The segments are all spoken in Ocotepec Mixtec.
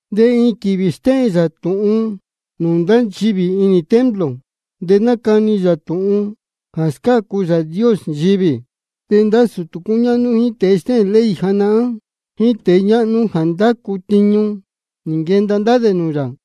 De iin quīvī stéhēn yā tūhun nūū ndá nchivī inī templo, de nácani yā tūhun jā scácu Yāā Dios nchivī. De ndá sūtū cúñáhnú, jíín tēe stéhēn ley janahán, jíín tēe ñáhnú jā ndácu tiñu, nī nquenda ndá dē nūū yā.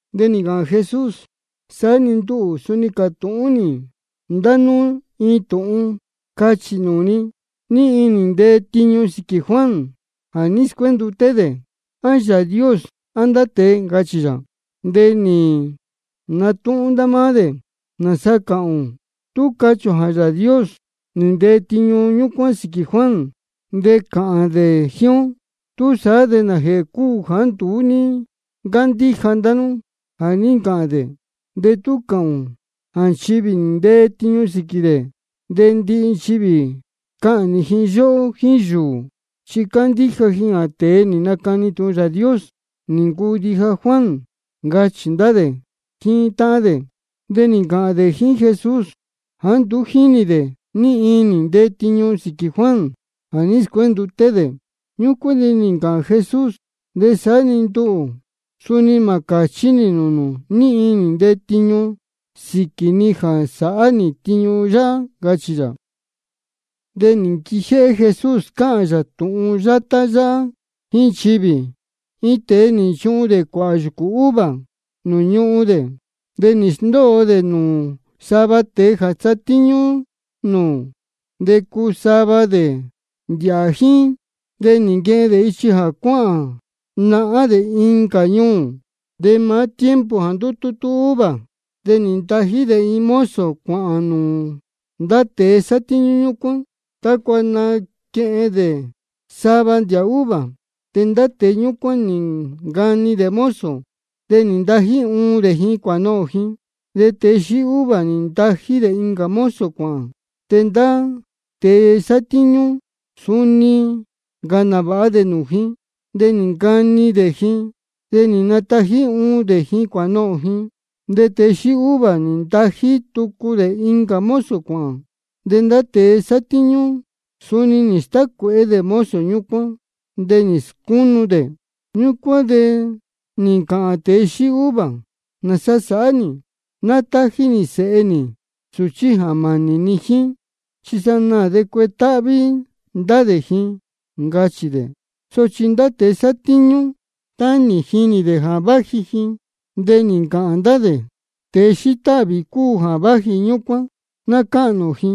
De nī ncāhān Jesús: Saá-ni nduhū suni cātūhún nī ndá nú iin tūhun. Cachī nūū ni: ¿Ní iin nī ntee tiñu sīquī Juan jā ní scuénduté dē? ¿A Yāā Dios, á ndá tēe? ncachī yā. Ñúcuán de nī natúhún ndá máá dē: ¿Nāsa cāhān ō? Tú cachī ō jā Yāā Dios nī ntee tiñu ñúcuán sīquī Juan, de cāhān dē jíín ó: ¿Túsaá de nājēhē cúu jāá nduú ní ncándíja ndá nú jā ní ncāhān dē? De tú cāhān ō jā nchivī nī ntee tiñu sīquī dē, de ndihi nchivī cahnī ji yóhó jíín yūū, chi cándíja ji jā tēe nī nacani tūhun Yāā Dios nī ncuu ndija Juan, ncachī ndá dē jíín táhán dē. De nī ncāhān dē jíín Jesús jāá nduú jínī dē ní iin nī ntee tiñu sīquī Juan jā ní scuénduté dē. Ñúcuán de nī ncāhān Jesús: De saá-ni nduhū, suni mā cāchí nī nūū nū ní iin nī ntee tiñu sīquī ni jā sáhá nī tiñu yáhá, ncachī yā. De nī nquijéhé Jesús cáhān yā tūhun yátá yáhá jíín nchivī: Iin tēe nī nchuhun dē cuāhā yūcū uva nūū ñuhun dē. De nī sndóo dē nūū sava tēe jā satíñú nūū, de cuu sava dē ndīhā jíín. De nī nquehen dē ichi jā cuáhān nahán dē incā ñuū. De maá tiempo jā ndutútú uva, de nī ntají dē iin mozo cuāhān nūū ndá tēe sátíñú ñúcuán, tácua naquehen dē sava ndīhā uva. De ndá tēe ñúcuán nī ncani dē mozo, de nī natají uun dē ji cuānohōn ji. De tēe xíí uva nī ntají dē incā mozo cuāhān. De ndá tēe sátíñú, suni nī ncāhān nāvāha dē nūū ji, de nī ncani dē ji, de nī natají uun dē ji cuānohōn ji. De tēe xíí uva nī ntají tucu dē incā mozo cuāhān. De ndá tēe sátíñú suni nī stácuēhé dē mozo ñúcuán, de nī scúnu dē. Ñúcuán de nī ncāhān tēe xíí uva: ¿Nāsa sāhá nī? Ná tájí nī sēhe nī, sūchí jā mānī ni jíín, chi sanaā de cuetáhví ndá dē ji, ncachī dē. Sochi ndá tēe sátíñú, tá nī jinī dē jā váji ji, de nī ncāhān ndá dē: Tēe xíí táhvī cúu jā váji ñúcuán. Ná cáhnī ō ji,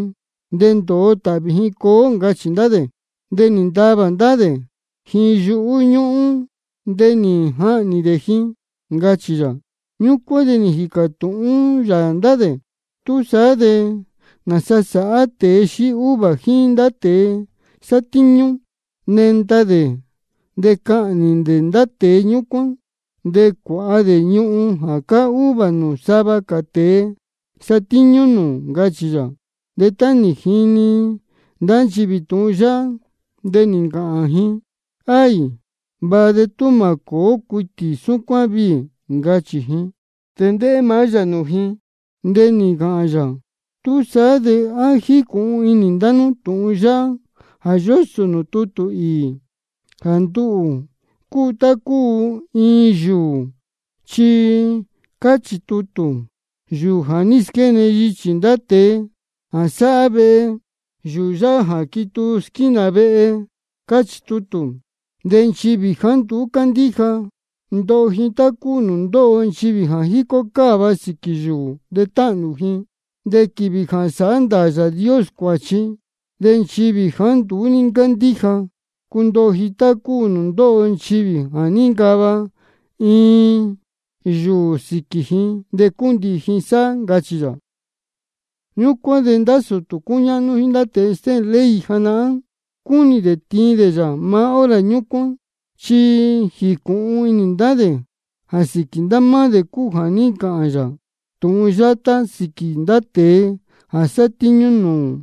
de ndōo tāhvī ji coo ó, ncachī ndá dē. De nī ntavā ndá dē ji yuhú ñúhún, de nī jahnī dē ji, ncachī yā. Ñúcuán de nī jīcā tūhún yā ndá dē: ¿Túsaá de nāsa sāhá tēe xíí uva jíín ndá tēe sátíñú? Nenda dē de cahnī dē ndá tēe ñúcuán, de cuāha dē ñuhun jā cáá uva nūū sava cā tēe satíñú nūū, ncachī yā. De tá nī jini ndá nchivī tūhun yáhá, de nī ncāhān ji: Aī, vāha de tú mā cōó cuitī súcuán viī, ncachī ji. De ndéhé maá yā nūū ji, de nī ncāhān yā: ¿Túsaá de á jícūhun inī ndá nú tūhun yáhá jā yósō nūū tutū īī, jā nduhū cúu tá cúu iin yūū? Chi cáchī tutū: Yūū jā ní squéne yichī ndá tēe jā sáhá vehe, yūū yáhá nduu jā quituu squínā vehe. Cáchī tutū. De nchivī jāá nduú cándíja, ndoho ji tá cúu nūū ndóho nchivī jā jícó cáva sīquī yūū de táhnū ji. De quīvī jā sāhá ndāā Yāā Dios cuāchi, de nchivī jāá nduú ní ncándíja, cundoho ji tá cúu nūū ndóho nchivī jā níncava iin yūū sīquī ji de cúndihī ji sáhá, ncachī yā. Ñúcuán de ndá sūtū cúñáhnú jíín ndá tēe stéhēn ley janahán, cúnī dē tiin dē yā maá hora ñúcuán. Chi nī jīcūhun inī ndá dē jā sīquī ndá máá dē cúu jā ní ncāhān yā tūhun yátá sīquī ndá tēe jā sátíñú nūū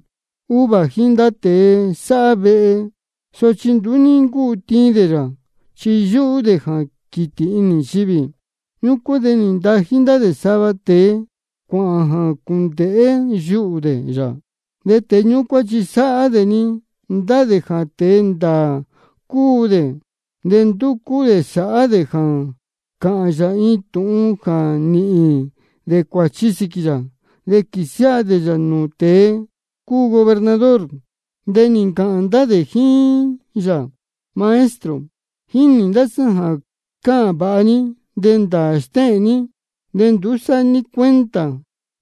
uva jíín ndá tēe sáhá vehe. Sochi nduú ní ncúu tiin dē yā, chi yúhú dē jā quītī inī nchivī. Ñúcuán de nī ntají ndá dē sava tēe cuāhān jā cūndēhé yuhū dē yā. De tēe ñúcuán chi sáhá-ni ndá dē jā tēe ndāā cúu dē. De ndúcú dē sāhá dē jā cāhān yā iin tūhun jā nīhīn dē cuāchi sīquī yā, de quīsiáha dē yā nūū tēe cúu gobernador. De nī ncāhān ndá dē jíín yā: Maestro, jínī ndá sá jā cáhān vāha ní, de ndāā stéhēn ní. De nduú sáhá ní cuenta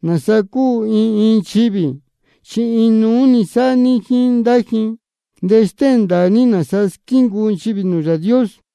nāsa cúu iin iin nchivī, chi inuú-ni sáhá ní jíín ndá ji. De stéhēn ndāā ní nāsa squíncuu nchivī nūū Yāā Dios.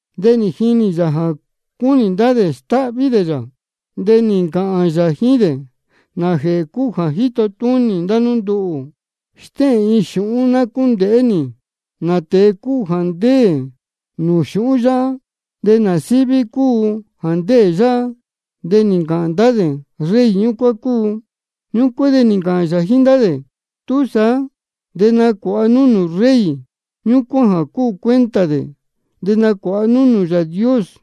De nī jinī yā jā cúnī ndá dē stáhví dē yā, de nī ncāhān yā jíín dē: ¿Nājēhē cúu jā jíto túnī ndá nú nduhū? Stéhēn iin xūhún ná cúndēhé nī. ¿Nā tēe cúu jā ndéē nūū xūhún yáhá, de nā síví cúu jā ndéē yáhá? De nī ncāhān ndá dē: Rey ñúcuán cúu. Ñúcuán de nī ncāhān yā jíín ndá dē: Túsaá de nacuāha nú nūū rey ñúcuán jā cúu cuenta dē, de nacuāha nú nūū Yāā Dios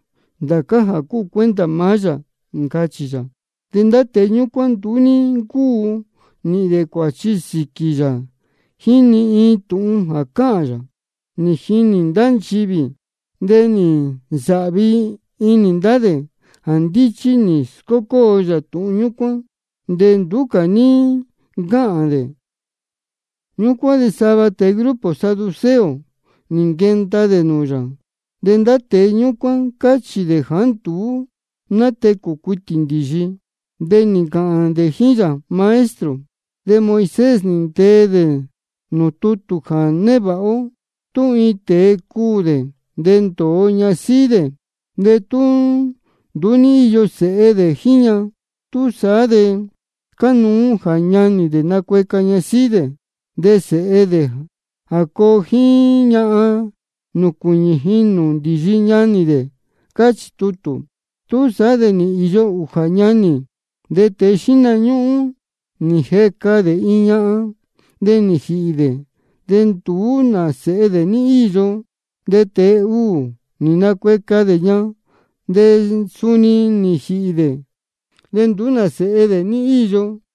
ndācá jā cúu cuenta maá yā, ncachī yā. De ndá tēe ñúcuán nduú ní ncúu nīhīn dē cuāchi sīquī yā jíín ni iin tūhun jā cáhān yā, nī jinī ndá nchivī. De nī nsāhvi inī ndá dē jā ndíchí nī scócóo yā tūhun ñúcuán, de nduú cā ní ncáhān dē. Ñúcuán de sava tēe grupo saduceo nī nquenda dē nūū yā. De ndá tēe ñúcuán cáchī dē jāá nduú nátecū cuitī ndīyi. De nī ncāhān dē jíín yā: Maestro, de Moisés nī ntee dē nūū tutū jā névāha ó: Tú iin tēe cuū dē, de ndōo ñasíhí dē, de tú nduú ní íyo sēhe dē jíín ña, túsaá de cánuú jā ñanī dē nacueca ñasíhí dē, de sēhe dē jā coo jíín ña nūcuīñī ji nūū ndīyi ñanī dē, cáchī tutū. Túsaá de nī īyo ūjā ñanī. De tēe xíhna ñúhún nī jeca dē iin ñahan. De nī jīhī dē, de nduú nā sēhe dē ní íyo. De tēe uū nī nacueca dē ña. De suni nī jīhī dē, de nduú nā sēhe dē ní íyo.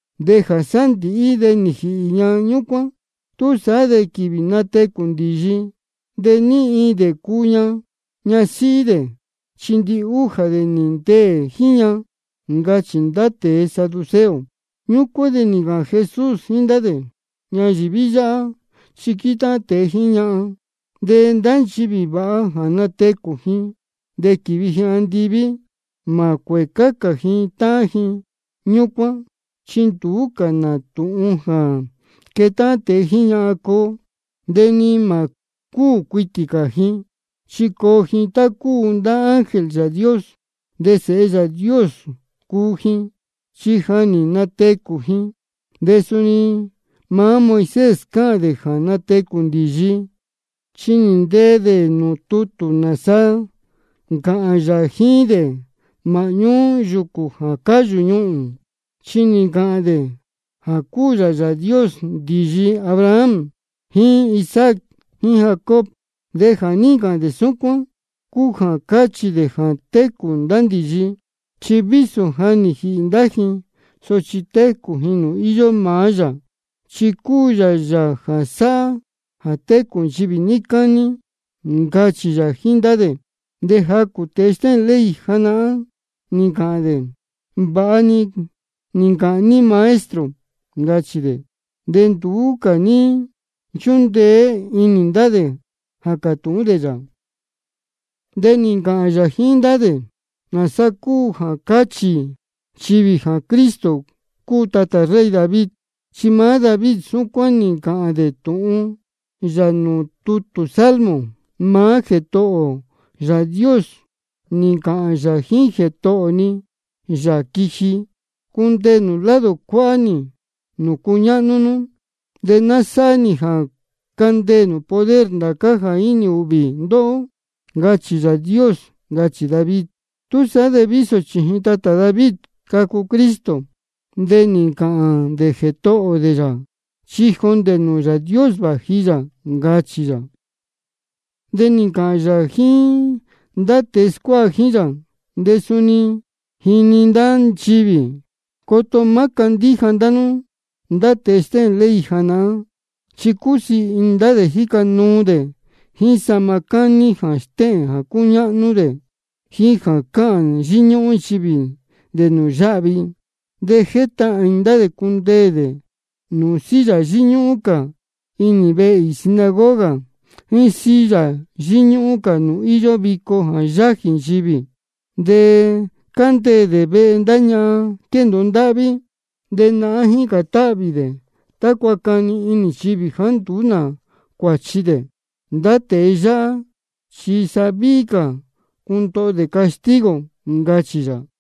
De jā sándīhí de nī jīhī ñahan ñúcuán. Túsaá de quīvī natecū ndīyi, ¿de ní iin dē cuu ña ñasíhí dē? Chi ndihújā dē nī ndeē jíín ña, ncachī ndá tēe saduceo. Ñúcuán de nī ncāhān Jesús jíín ndá dē: Ñayīví yáhá chi quétáhán tēe jíín ñahan. De ndá nchivī vāha jā natecū ji de quīvi ji andiví, mā cuēcá cā ji táhán ji ñúcuán, chi nduú cā nā tūhun jā quétáhán tēe jíín ñahan coo. De ni mā cúū cuitī cā ji, chi coo ji tá cúu ndá ángel Yāā Dios. De sēhe Yāā Dios cuu ji, chi ja nī natecū ji. De suni maá Moisés cáhān dē jā natecū ndīyi, chi nī ntee dē nūū tutū nāsa nī ncāhān yā jíín dē māhñú yūcū jā cáyū ñuhūn. Chi nī ncāhān dē jā cúu yā Yāā Dios ndīyi Abraham jíín Isaac jíín Jacob. De jā ní ncāhān dē súcuán cúu jā cáchī dē jā técū ndá ndīyi. Chi vísō ja nī jīhī ndá ji, sochi técū ji nūū íyó maá yā, chi cúu yā Yāā jā sáhá jā técū nchivī níí cání, ncachī yā jíín ndá dē. De jacū tēe stéhēn ley janahán nī ncāhān dē: Vāha nī ncāhān ní Maestro, ncachī dē. De nduú cā ní nchúndeé inī ndá dē jā cātūhún dē yā. De nī ncāhān yā jíín ndá dē: ¿Nāsa cúu jā cáchī nchivī jā Cristo cúu tatā rey David? Chi maá David súcuán nī ncāhān dē tūhun yā nūū tutū Salmo: Maá Jētohō ō Yāā Dios nī ncāhān yā jíín Jētohō ni, Yāā quiji: Cundeē nū lado cuáhá nī nūū cuñáhnú nú, de ná sáhá nī jā candeē nū poder ndācá jā jínī ūhvī ndóhó. Ncachī Yāā Dios. Ncachī David. Túsaá de vísō chījin tatā David cacu Cristo, de nī ncāhān dē Jētohō dē yā, chi jondē nūū Yāā Dios vāji yā, ncachī yā. De nī ncāhān yā jíín ndá tēe scuáha jíín yā, de suni nī jini ndá nchivī: Coto má cándíja ndá nú ndá tēe stéhēn ley janahán. Chi cúsiī inī ndá dē jíca nuu dē jíín sahma cání jā stéhēn jā cúñáhnú dē, jíín jā cáhān yíñúhún nchivī dē nūū yáhvi. De jétahān inī ndá dē cundeē dē nūū silla yíñúhún cā inī vehe īī sinagoga, jíín silla yíñúhún cā nūū íyó vico jā yájī nchivī. De cándeē dē vehe ndá ñahan quéndōo ndáhví. De nahán jícān táhvī dē tácua cani inī nchivī jāá nduú nā cuāchi dē. Ndá tēe yáhá chi sa víhí cā ndoho dē castigo, ncachī yā.